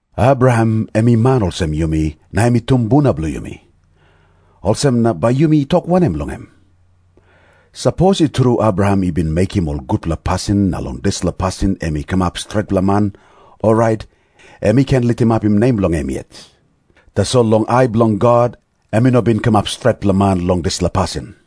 Abraham em i man olsem yumi, na em i tumbuna bilong yumi. Olsem na bai yumi tok wanem long em? Sapos i tru Abraham i bin mekim ol gutpela pasin na long dispela pasin em i kamap stretpela man, orait em i ken litimapim nem bilong em yet. Tasol long ai bilong God em i no bin kamap stretpela man long dispela pasin.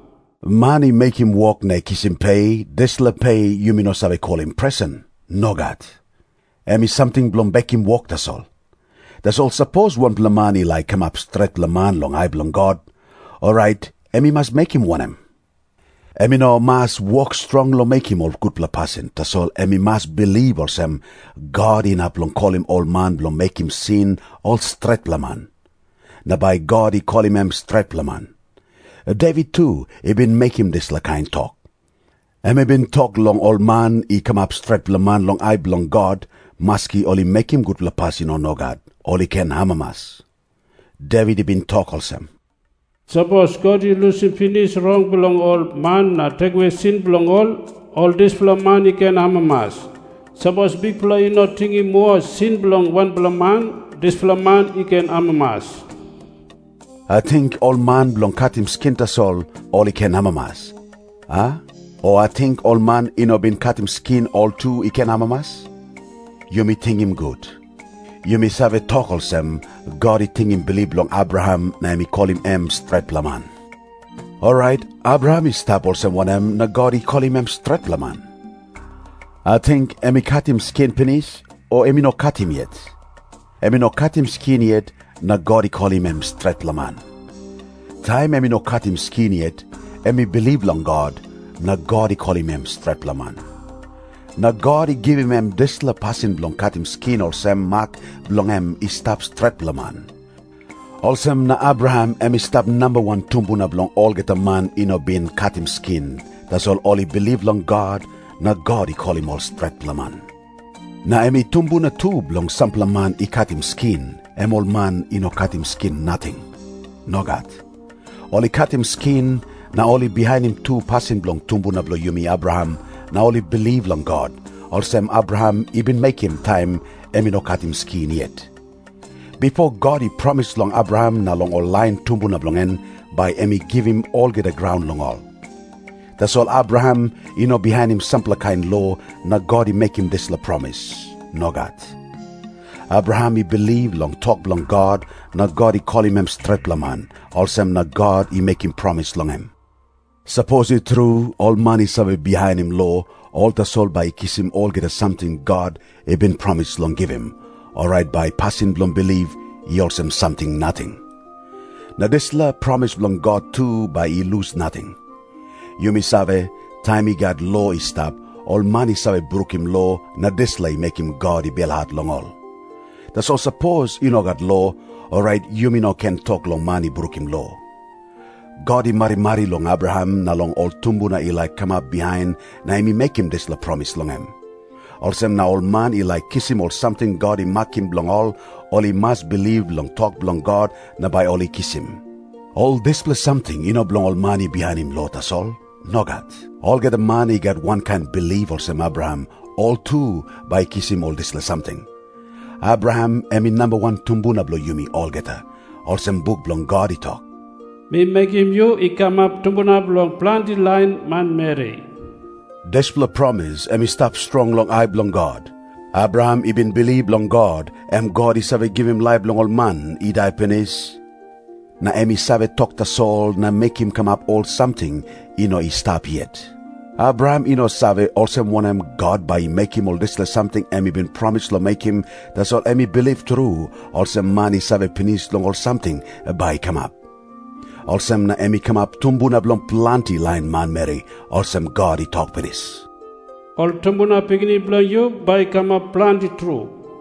Man i mekim wok na i kisim pe, dispela pe yumi no save kolim presen. Nogat. Em i samting bilong bekim wok tasol. Tasol sapos wanpela man i laik kamap stretpela man long ai bilong God, orait em i mas mekim wanem? Em i no mas wok strong long mekim ol gutpela pasin, tasol em i mas bilip olsem, God inap long kolim ol man bilong mekim sin ol stretpela man. Na bai God i kolim em stretpela man. Devit tu i bin mekim dispela kain tok. Em i bin tok long ol man i kamap stretpela man long ai bilong God, maski ol i mekim gutpela pasin o nogat, ol i ken amamas. Devit i bin tok olsem, "Sapos God i lusim pinis rong bilong ol man na tekewe sin bilong ol, ol dispela man i ken amamas. Sapos Bikpela i no tingim moa sin bilong wanpela man, dispela man i ken amamas." Ating ol man bilong katim skin tasol, ol i ken amamas, a? O ating ol man i no bin katim skin ol tu i ken amamas? Yumi tingim gut. Yumi save tok olsem, God i tingim bilip bilong Abraham na em i kolim em stretpela man. Orait Abraham i stap olsem wanem na God i kolim em stretpela man? Ating em i katim skin pinis, o em i no katim yet? Em i no katim skin yet na God i kolim em stretpela man. Taim em i no katim skin yet, em i bilip long God, na God i kolim em stretpela man. Na God i givim em dispela pasin bilong katim skin olsem mak bilong em i stap stretpela man. Olsem na Abraham em i stap namba wan tumbuna bilong olgeta man i no bin katim skin, tasol ol i bilip long God na God i kolim ol stretpela man. Na em i tumbuna tu bilong sampela man i katim skin, em ol man i no katim skin nating. Nogat. Ol i katim skin, na ol i bihainim tu pasin bilong tumbuna bilong yumi Abraham na ol i bilip long God, olsem Abraham i bin mekim taim em i no katim skin yet. Bipo God i promis long Abraham na long ol lain tumbuna bilong en, bai em i givim olgeta graun long ol. Tasol Abraham i no bihainim sampela kain lo na God i mekim dispela promis. Nogat. Abraham i bilip long tok bilong God na God i kolim em stretpela man, olsem na God i mekim promis long em. Sapos i tru, ol man i save bihainim lo, ol tasol bai i kisim olgeta samting God i bin promis long givim, orait bai pasin bilong bilip i olsem samting nating. Na dispela promis bilong God tu bai i lus nating. Yumi save, taim i gat lo i stap, ol man i save brukim lo, na dispela i mekim God i belhat long ol. Tasol sapos i no gat lo, orait yumi no ken tok long man i brukim lo. God i marimari long Abraham na long ol tumbuna i laik kamap bihain na em i mekim dispela promis long em. Olsem na ol man i laik kisim ol samting God i makim bilong ol, ol i mas bilip long tok bilong God na bai ol i kisim. Ol dispela samting i no bilong ol man i bihainim lo tasol. Nogat. Olgeta man i gat wankain bilip olsem Abraham, ol tu bai i kisim ol dispela samting. Abraham em i namba wan tumbuna bilong yumi olgeta, olsem buk bilong God i tok, "Mi mekim yu i kamap tumbuna bilong planti lain manmeri." Dispela promis em i stap strong long ai bilong God. Abraham i bin bilip long God, em God i save givim laip long ol man i dai pinis, na em i save tok tasol, na mekim kamap ol samting i no i stap yet. Abraham i no save, olsem wanem God bai i mekim ol dispela samting em i bin promis long mekim, tasol em i bilip tru, olsem man i save pinis long ol samting bai i kamap. Olsem na em i kamap "tumbuna bilong planti lain manmeri," olsem God i tok pinis, "Ol tumbuna pikinini bilong yu bai i kamap planti tru."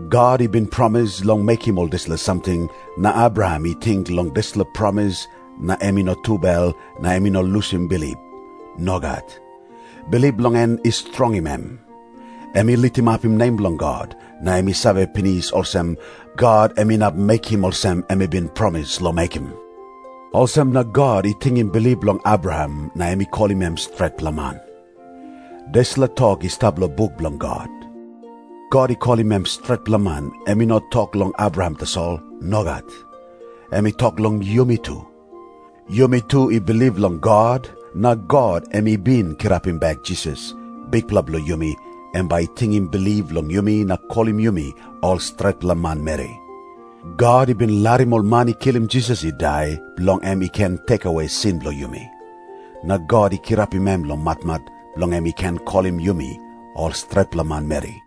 God i bin promis long mekim ol dispela samting, na Abraham i ting long dispela promis na em i no tubel na em i no lusim bilip. Nogat. Bilip bilong en i strongim em. Em i litimapim nem bilong God na em i save pinis olsem, God em inap mekim olsem em i bin promis long mekim. Olsem na God i tingim bilip bilong Abraham "na em i kolim em stretpela man." Dispela tok i stap long buk bilong God, "God i kolim em stretpela man," em i no tok long Abraham tasol. Nogat. Em i tok long yumi tu. Yumi tu i bilip long God, na God, em i bin kirapim bek Jisas, Bikpela bilong yumi, em bai i tingim bilip bilong yumi na kolim yumi ol stretpela manmeri. God i bin larim ol man i kilim Jisas i dai, bilong em i ken tekewe sin bilong yumi. Na God i kirapim em long matmat, bilong em i ken kolim yumi ol stretpela manmeri.